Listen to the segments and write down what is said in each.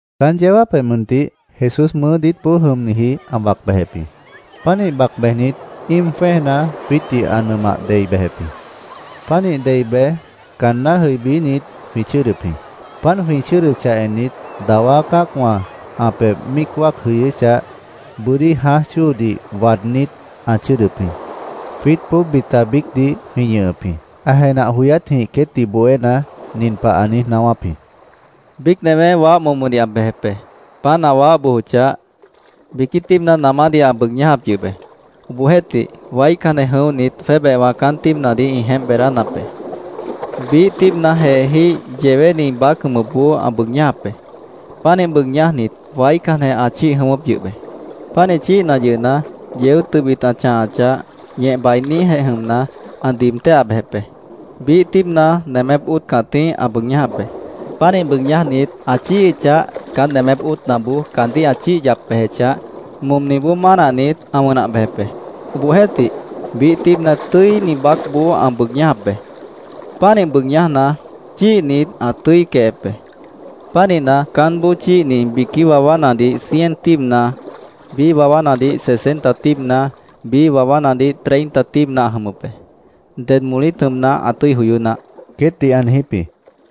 Caán yeó jáapjeh mʉntih Jesús mʉʉ́ diítboó jʉmniji ã bac bejep jĩ. Pánih bac bejnit, íim jwẽ́ejna jwiítdih ã nʉmah dei bejep jĩ. Pánih dei bej, caanná jʉibínit, jwĩ chʉ́ʉdʉp jĩ. Páant jwĩ chʉ́ʉdʉchah ennit, dawá cã́acwã ã pebh míic wáac jʉyʉ́chah, bʉ́dí jãáj chóodih waadnít, ã chʉ́ʉdʉp jĩ. Jwiítboó bita biícdih jwĩ ñʉhʉp jĩ. Ã jenah joyátjĩh queétdih bohéna, nin pah ã niíj naáwáp jĩ: “Biíc newé, waáh momodih ã bejep be. Páant ã waáh bojochah, biquí tíibna namádih ã bʉʉg ñájap yʉh be. Obohjeéhtih, waícanjeh jʉ̃óhnit, jwébehwã caán tíibnadih ĩ jeémp beedánap be. Biíh tíibna jeejíh yewéni baác jʉmʉpboó ã bʉʉg ñájap be. Pánih bʉʉg ñájnit, waícanjeh ã chíih jʉ̃ʉ́wʉ́p yʉh be. Pánih chíihna yʉhna, yeó tʉbit ã chãhachah, ñeh bainíjeh jʉmna, ã diib téhah bejep be. Biíh tíibna nemép óot cãtíh ã bʉʉg ñájap be. Pánih bʉʉg ñájnit, ã chíihichah, caán nemép óotnaboó caandíh ã chíih yap bejechah, momniboó mánahnit, ã wʉnah bejep be. Obohjeéhtih, biíh tíibna tʉ́ini baácboó ã bʉʉg ñájap be. Pánih bʉʉg ñájna, chíihnit, ã tʉ́i quehep be. Pánihna, caánboó chíihni biquí wawánadih cien tíibna, biíh wawánadih sesenta tíibna, biíh wawánadih treinta tíibna ã jʉmʉp be. ¡Ded molít jʉmna, ã tʉ́i joyó naáh!” queétdih ã niijíp jĩ.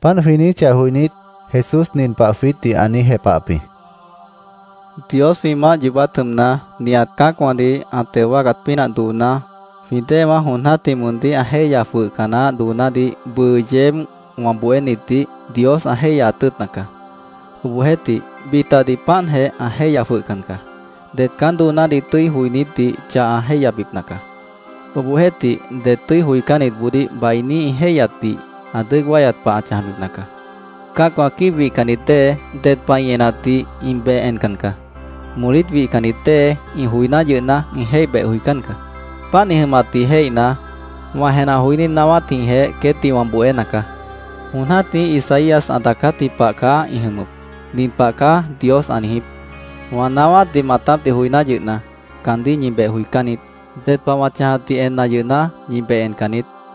Páant jwĩ niijíchah joinít, Jesús nin pah jwiítdih ã niíj jepahap jĩ: —Dios jwĩ maáh yoobát jʉmna, nihat cã́acwãdih ã teo wáacat pínah dooná, jwĩ déewã jon jã́tih moondíh ã jéihya jwʉhca naáh doonádih bʉʉ yeéb wã bohénitdih Dios ã jéihyaat tʉ́ʉtna caá. Obohjeéhtih, bitadih páantjeh ã jéihya jwʉhcan caá. Det caán doonádih tʉ́i joinítdih chah ã jéihyabipna caá. Obohjeéhtih, det tʉ́i joicánnitboodíh bainí ĩ jéihyatdih ã dʉ́ʉc wáyat pah ã chãjbipna caá. Cã́acwã quíib wihcannit dée, ded pah ĩ enatdih ĩ beh encan caá. Molít wihcannit dée, ĩ joiná yʉhna, ĩ jéih beh joicán caá. Páant ĩ jʉmatdih jéihna, wã jenah joiní naáwátjĩhjeh queétdih wã bohéna caá. Jon jã́tih Isaías ã daacátji pah caá ĩ jʉmʉp. ‘Nin pah caá Dios ã niijíp: “Wã naáwátdih maatápdih joiná yʉhna, caandíh ñi beh joicán niít. Ded pah wã chãjatdih enna yʉhna, ñi beh encan niít.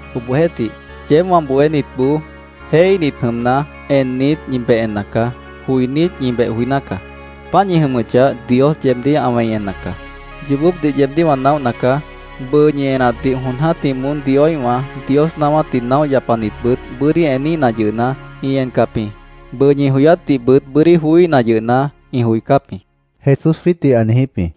“Obohjeéhtih, yeéb wã bohénitboó jéihíhnit jʉmna, ennit, ñi beh enna caá. Joinít, ñi beh joiná caá. Páant ñi jʉmʉchah, Dios yeebdíh ã wẽi enna caá. Yoobópdih yeebdíh wã naóhna caá. Bʉʉ ñi enatdih jon jã́tih moón Dioíhwã, Dios naáwátdih naóh yapanitbʉt bʉ́dí eníhna yʉhna, ĩ encap jĩ. Bʉʉ ñi joyátdihbʉt bʉ́dí joííhna yʉhna, ĩ joicáp jĩ”, Jesús jwiítdih ã niijíp jĩ.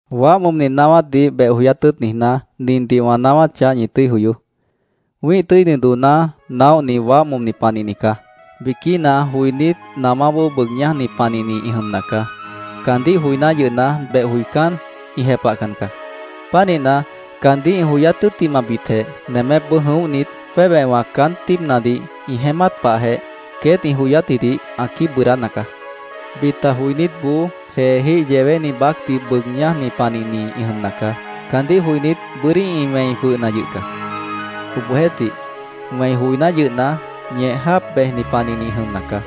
“Waáh momni naáwátdih beh joyát tʉ́ʉt niijná, nindih wã naáwáchah, ñi tʉ́i joyoó. Wĩ́ih tʉ́ini dooná naóhni waáh momni panihni caá. Biquína joinít namáboó bʉʉg ñájni panihni ĩ jʉmna caá. Caandíh joiná yʉhna, beh joicán, ĩ jepahcan caá. Pánihna, caandíh ĩ joyát tʉ́ttimahbitjeh, nemépboó jʉ̃óhnit, jwébehwã caán tíibnadih ĩ jeémát pahjeh, queét ĩ joyátjidih ã quíib bʉʉdána caá. Bita joinítboó, jeejíh yewéni baácdih bʉʉg ñájni panihni ĩ jʉmna caá. Caandíh joinít, bʉ́dí ĩ wẽi jwʉhna yʉh caá. Obohjeéhtih, wẽi joiná yʉhna, ñeh jáap bejni panihni ĩ jʉmna caá.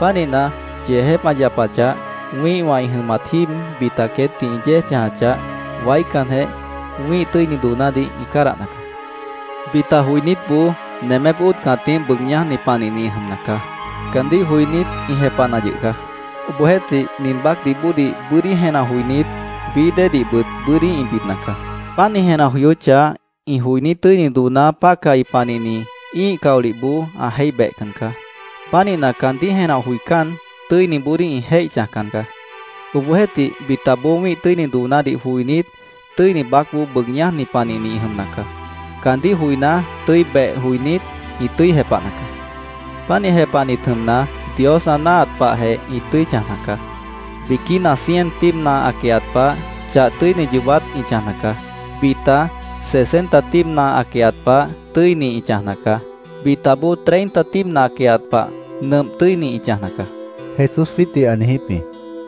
Pánihna, yeejép ã yapachah, wĩ́ihwã ĩ jʉmat jíib bita queétdih ĩ yéej chãjachah, waícanjeh wĩ́ih tʉ́ini doonádih ĩ cádahna caá. Bita joinítboó nemép óotna cãtíh bʉʉg ñájni panihni ĩ jʉmna caá. Caandíh joinít, ĩ jepahna yʉh caá. Obohjeéhtih, nin baácdih bóodih bʉ́dí jenah joinít, bií déedihbʉt bʉ́dí ĩ bidna caá. Páant ĩ jenah joyóchah, ĩ joiní tʉ́ini dooná pácahi panihni ĩ́ih caolihboó ã jéih behcan caá. Pánihna, caandíh jenah joicán, tʉ́iniboodíh ĩ jéih chãjcan caá. Obohjeéhtih, bitaboó wĩ́ih tʉ́ini doonádih joinít, tʉ́ini baácboó bʉʉg ñájni panihni ĩ jʉmna caá. Caandíh joiná, tʉ́i beh joinít, ĩ tʉ́i jepahna caá. Pánih jepahnit jʉmna, Dios ã náahat pahjeh ĩ tʉ́i chãjna caá. Biquína, cien tíibna ã quehat pah, chah tʉ́ini yoobát ĩ chãjna caá. Bita, sesenta tíibna ã quehat pah, tʉ́ini ĩ chãjna caá. Bitaboó, treinta tíibna ã quehat pah, nʉmp tʉ́ini ĩ chãjna caá”, Jesús jwiítdih ã niijíp jĩ.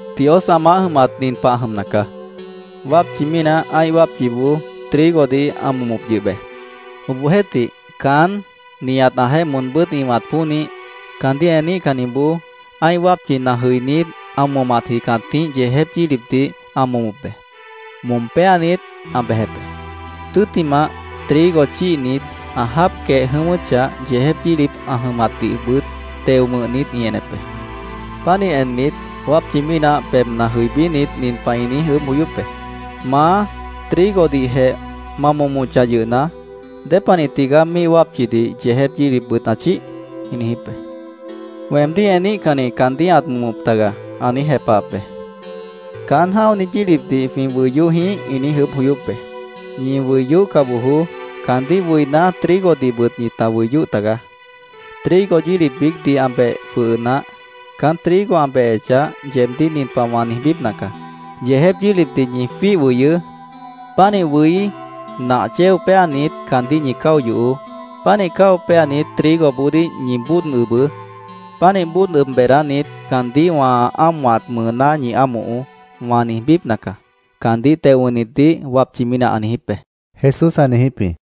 “Dios ã maáh jʉmat nin pah ã jʉmna caá: Wápchi mínah ã́ih wápchiboó trigodih ã momop yʉh be. Obohjeéhtih, caán, nihat ãjeéh moonbʉ́t ĩ ʉ̃wat pónih, caandíh eníhcanniboó ã́ih wápchina jʉinít, ã momatji cãtíh yeejép yílipdih ã momop be. Mom péanit, ã bejep be. Tʉ́ttimah, trigo chíihnit, ã jáap quehe jʉ̃ʉ́wʉ́chah, yeejép yílip ã jʉmatdihbʉt teo wʉ̃hnit ĩ enep be. Pánih ennit, wápchi mínah pebhna jʉibínit, nin pah ĩ niíj ʉʉ́bh joyóp be: ‘¿Maá, trigodihjeh ma momochah yʉhna, dépanih tigaá míih wápchidih yeejép yílipbʉt ã chíih?’ ĩ niijíp be. ‘Weemdíh eníhcanni caandíh ãt momop taga’, ã niíj jepahap be. ‘¿Caán jã́oni yílipdih jwĩ wʉi yóh jĩíh?’ ĩ niíj ʉʉ́bh joyóp be. ‘Ñi wʉi yóhca bojoó. Caandíh wʉiná, trigodihbʉt ñita wʉi yóh tagaá. Trigo yílip biícdih ã beh jwʉhʉ naáh. Caán trigo ã behechah, yeebdíh nin pah wã niijbípna caá: “Yeejép yílipdih ñi jwíih wʉyʉʉ́. Pánih wʉí, nah chéo péanit, caandíh ñi cáo yohoó. Pánih cáo péanit, trigoboodíh ñi bóod ʉbʉʉ́. Pánih bóod ʉb beedánit, caandíh wã ámohat mʉʉná ñi ámohoó”, wã niijbípna caá’, caandíh teo wʉ̃hnitdih wápchi mínah ã niijíp be”, Jesús ã niijíp jĩ.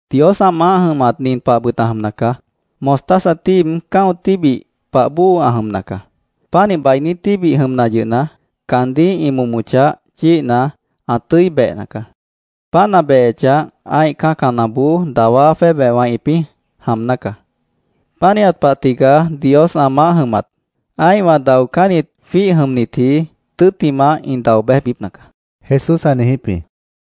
“Dios ã maáh jʉmat nin pahbʉt ã jʉmna caá: Mostaza tíib cã́o tíbih pah bóo ã jʉmna caá. Pánih bainí tíbih jʉmna yʉhna, caandíh ĩ momochah, chíihna, ã tʉ́i behna caá. Páant ã behechah, ã́ih cã́canaboó dawá jwébehwã ĩpĩ́ jaamná caá. Pánihat pah tigaá Dios ã maáh jʉmat. Ã́ihwã daocánnit jwíih jʉmnitji, tʉ́ttimah ĩ dao béjbipna caá”, Jesús ã niijíp jĩ.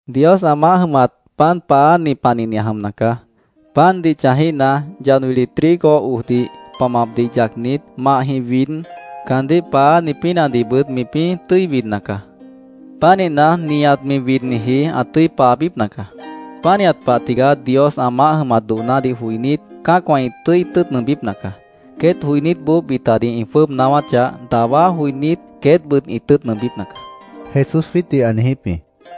“Dios ã maáh jʉmat pan paááni panihni ã jʉmna caá. Pandih chãjíhna, yad wili trigo ojdih pamapdih yacnit, mahjĩh wid, caandíh paááni pínahdihbʉt mipĩ́ tʉ́i widna caá. Pánihna, nihat mi widniji ã tʉ́i paabípna caá. Pánihat pah tigaá Dios ã maáh jʉmat doonádih joinít, cã́acwã ĩ tʉ́ʉt nʉʉmbípna caá. Queét joinítboó bitadih ĩ jwʉ́ʉb naáwáchah, dawá joinít, queétbʉt ĩ tʉ́ʉt nʉʉmbípna caá”, Jesús jwiítdih ã niijíp jĩ.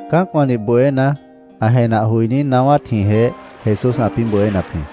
Cã́acwãdih bohéna, ã jenah joiní naáwátjĩhjeh Jesús ãpĩ́ bohénap jĩ.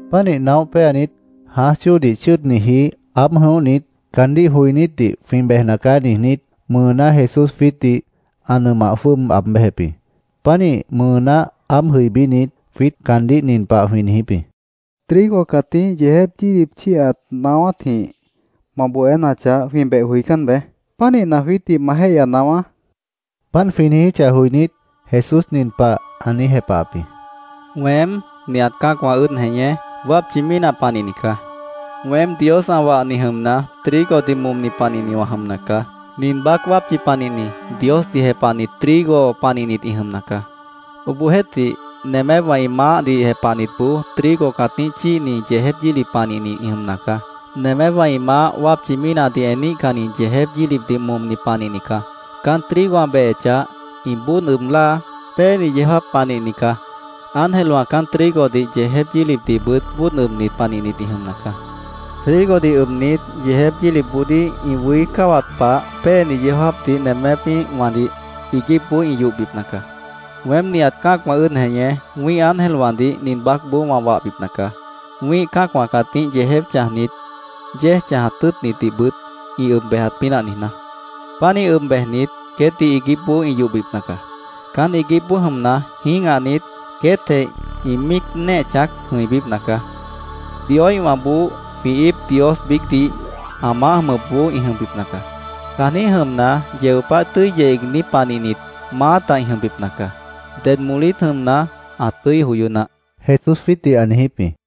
Pánih naóh péanit, jãáj chóodih chʉ́ʉdniji aáb jʉ̃óhnit, caandíh joinítdih “Jwĩ bejna caá”, niijnít, mʉʉná Jesús jwiítdih ã nʉmah jwʉ́ʉb aab béjep jĩ. Pánih mʉʉná aáb jʉibínit, jwiít caandíh nin pah jwĩ niijíp jĩ: —Trigo cãtíh yeejép yílip chíihat naáwátjĩh ma bohénachah, jwĩ beh joicán beé. Pánihna, jwiítdih ma jéihya naáwá, jwĩ niijíp jĩ. Páant jwĩ niijíchah joinít, Jesús nin pah ã niíj jepahap jĩ: —Weém, nihat cã́acwã ʉ́ʉd jeñé, wápchi mínah panihni caá. Weém Dios ã wahni jʉmna, trigodih momni panihni wã jʉmna caá. Nin baác wápchi panihni, Diosdih jepahnit trigo panihnit ĩ jʉmna caá. Obohjeéhtih, nemépwã ĩ maáhdih jepahnitboó trigo cãtíh chíihni yeejép yílip panihni ĩ jʉmna caá. Nemépwã ĩ maáh wápchi mínahdih eníhcanni yeejép yílipdih momni panihni caá. Caán trigo ã behechah, ĩ bóod ʉb láa, péeni yeó jáap panihni caá. Ángelwã caán trigodih yeejép yílipdihbʉt bóod ʉbnit panihnit ĩ jʉmna caá. Trigodih ʉbnit, yeejép yílipboodíh ĩ wʉí cáwat pah péeni yeó jáapdih nemépíhwãdih iiguípboó ĩ yohbipna caá. Weém nihat cã́acwã ʉ́ʉd jeñé, wĩ́ih ángelwãdih nin baácboó wã wahbipna caá, wĩ́ih cã́acwã cãtíh yeejép chãjnit, yéej chãjat tʉ́ʉtnitdihbʉt ĩ ʉb bejat pínah niijná. Pánih ʉb bejnit, queétdih iiguípboó ĩ yohbipna caá. Caán iiguípboó jʉmna, jĩ́gahnit, queétjeh ĩ míic néeh chãác jʉ̃ibípna caá. Dioíhwãboó jwĩ íip Dios biícdih ã maáh jʉmʉpboó ĩ jʉmbipna caá. Caanjĩ́h jʉmna, yeo páh tʉ́i yeh iigní panihnit, maáta ĩ jʉmbipna caá.¡Ded molít jʉmna, ã tʉ́i joyó naáh! Jesús jwiítdih ã niijíp jĩ.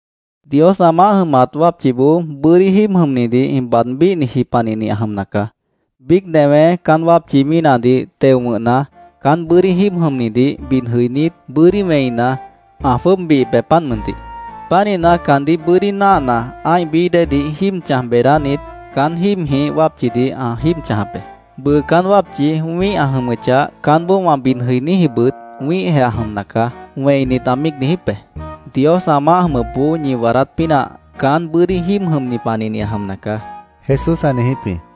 “Dios ã maáh jʉmat wápchiboó bʉ́dí jíib jʉmnidih ĩ baad bíhniji panihni ã jʉmna caá. Biíc newé caán wápchi mínahdih teo wʉ̃hna, caán bʉ́dí jíib jʉmnidih bid jʉinít, bʉ́dí wẽina, ã jwʉ́ʉb bihip be, páant mʉntih. Pánihna, caandíh bʉ́dí náahna, ã́ih bií déedih jíib chãj beedánit, caán jíibjĩh wápchidih ã jíib chãjap be. ‘Bʉʉ caán wápchi wĩ́ih ã jʉmʉchah, caánboó wã bid jʉiníjibʉt wĩ́ihjeh ã jʉmna caá’, wẽinit, ã míic niijíp be. Dios ã maáh jʉmʉpboó ñi waadát pínah caán bʉ́dí jíib jʉmni panihni ã jʉmna caá”, Jesús ã niijíp jĩ.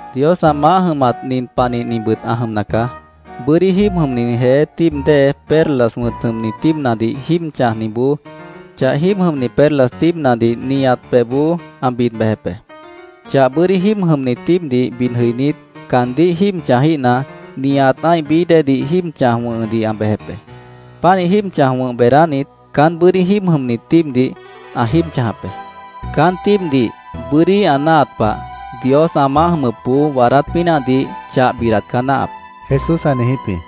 “Dios ã maáh jʉmat nin panihnibʉt ã jʉmna caá. Bʉ́dí jíib jʉmni jeé tíib dée perlas wʉ̃t jʉmni tíibnadih jíib chãjniboó chah jíib jʉmni perlas tíibnadih nihat pebhboó ã bid bejep be. Chah bʉ́dí jíib jʉmni tíibdih bid jʉinít, caandíh jíib chãjíhna, nihat ã́ih bií déedih jíib chãj wʉ̃hʉdih ã bejep be. Pánih jíib chãj wʉ̃h beedánit, caán bʉ́dí jíib jʉmni tíibdih ã jíib chãjap be. Caán tíibdih bʉ́dí ã náahat pah, Dios ã maáh jʉmʉpboó waadát pínahdih chah bidat caá náahap”, Jesús ã niijíp jĩ.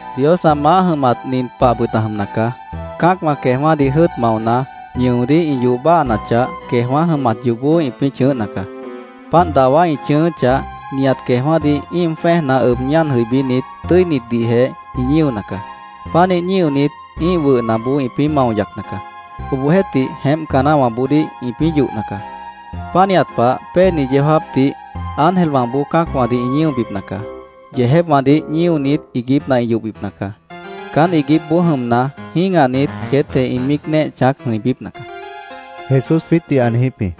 “Dios ã maáh jʉmat nin pahbʉt ã jʉmna caá. Cã́acwã queejwã́dih jʉ́ʉt maona, ñʉodíh ĩ yoh báahanachah, queejwã́ jʉmat yoobó ĩpĩ́ chʉ̃ʉ́hna caá. Páant dawá ĩ chʉ̃ʉ́ʉ́chah, nihat queejwã́dih íim jwẽ́ejna ʉb ñáan jʉibínit, tʉ́initdihjeh ĩ ñíona caá. Pánih ñíonit, ĩ́ih wʉhnaboó ĩpĩ́ mao yacna caá. Obohjeéhtih, jeémpca naáhwãboodíh ĩpĩ́ yohna caá. Pánihat pah, péeni yeó jáapdih ángelwãboó cã́acwãdih ĩ ñíobipna caá. Yeejépwãdih ñíonit, iiguípna ĩ yohbipna caá. Caán iiguípboó jʉmna, jĩ́gahnit, queétjeh ĩ míic néeh chãác jʉ̃ibípna caá”, Jesús jwiítdih ã niijíp jĩ.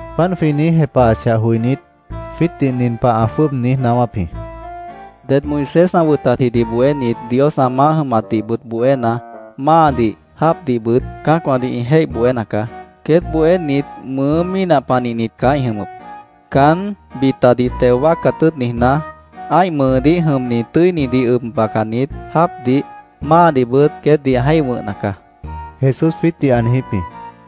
Páant jwĩ niíj jepahachah joinít, jwiítdih nin pah ã jwʉ́ʉb niíj naáwáp jĩ: —Det Moisés ã wʉtatjidih bohénit Dios ã maáh jʉmatdihbʉt bohéna, máadih, jáapdihbʉt cã́acwãdih ĩ jéih bohéna caá. Queét bohénit mʉʉ́ mínah panihnit caá ĩ jʉmʉp. Caán, bitadih teo wáacat tʉ́ʉt niijná, ã́ih mʉʉdíh jʉmni tʉ́inidih ʉb bacanit, jáapdih, máadihbʉt queétdih ã jéih wʉ̃hna caá, Jesús jwiítdih ã niijíp jĩ.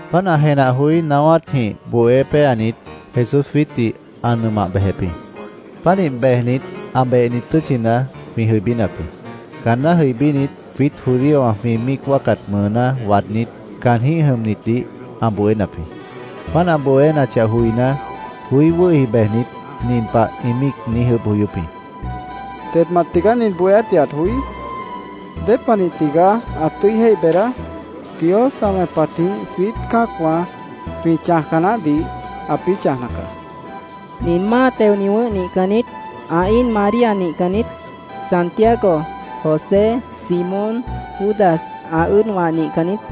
Páant ã jenah joiní naáwátnajĩh bohé péanit, Jesús jwiítdih ã nʉmah bejep jĩ. Pánih bejnit, ã behni tʉ́tchina jwĩ jʉibínap jĩ. Caanná jʉibínit, jwiít judíowã jwĩ míic wáacat mʉʉná waadnít, caanjĩ́h jʉmnitdih ã bohénap jĩ. Páant ã bohénachah joiná, joí wʉ́hi bejnit, nin pah ĩ míic niíj ʉʉ́bh joyóp jĩ: —¿Dedmant tigaá nin bohéátdih ãt joí? ¿Dépanih tigaá ã tʉ́i jéih beedá? Dios ã wẽpatjĩh jwiít cã́acwã jwĩ chãjca naáhdih ãpĩ́ chãjna caá. ¿Nin máa teoni wʉ̃ʉ́h nihcan niít? ¿Ã íin María nihcan niít? ¿Santiago, José, Simón, Judas, ã ʉ́ʉdwã nihcan niít?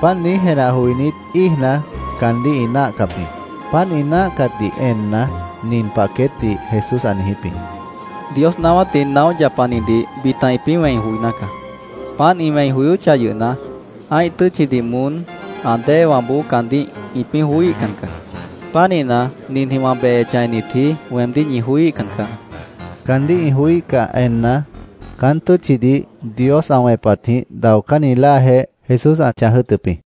Páant niíj jenah joinít, íijna, caandíh ĩ náahcap jĩ. Páant ĩ náahcatdih enna, nin pah queétdih Jesús ã niijíp jĩ: —Dios naáwátdih naóh yapanidih bita ĩpĩ́ wẽi joiná caá. Páant ĩ wẽi joyóchah yʉhna, ã́ih tʉ́tchidih moón, ã déewãboó caandíh ĩpĩ́ joííhcan caá. Pánihna, ninjĩh wã behechah ennitji, weemdíh ñi joííhcan caá, ã niijíp jĩ. Caandíh ĩ joííhcah enna, caán tʉ́tchidih Dios ã wẽpatjĩh daocánni láajeh Jesús ã chãj jʉ́ʉtʉp jĩ.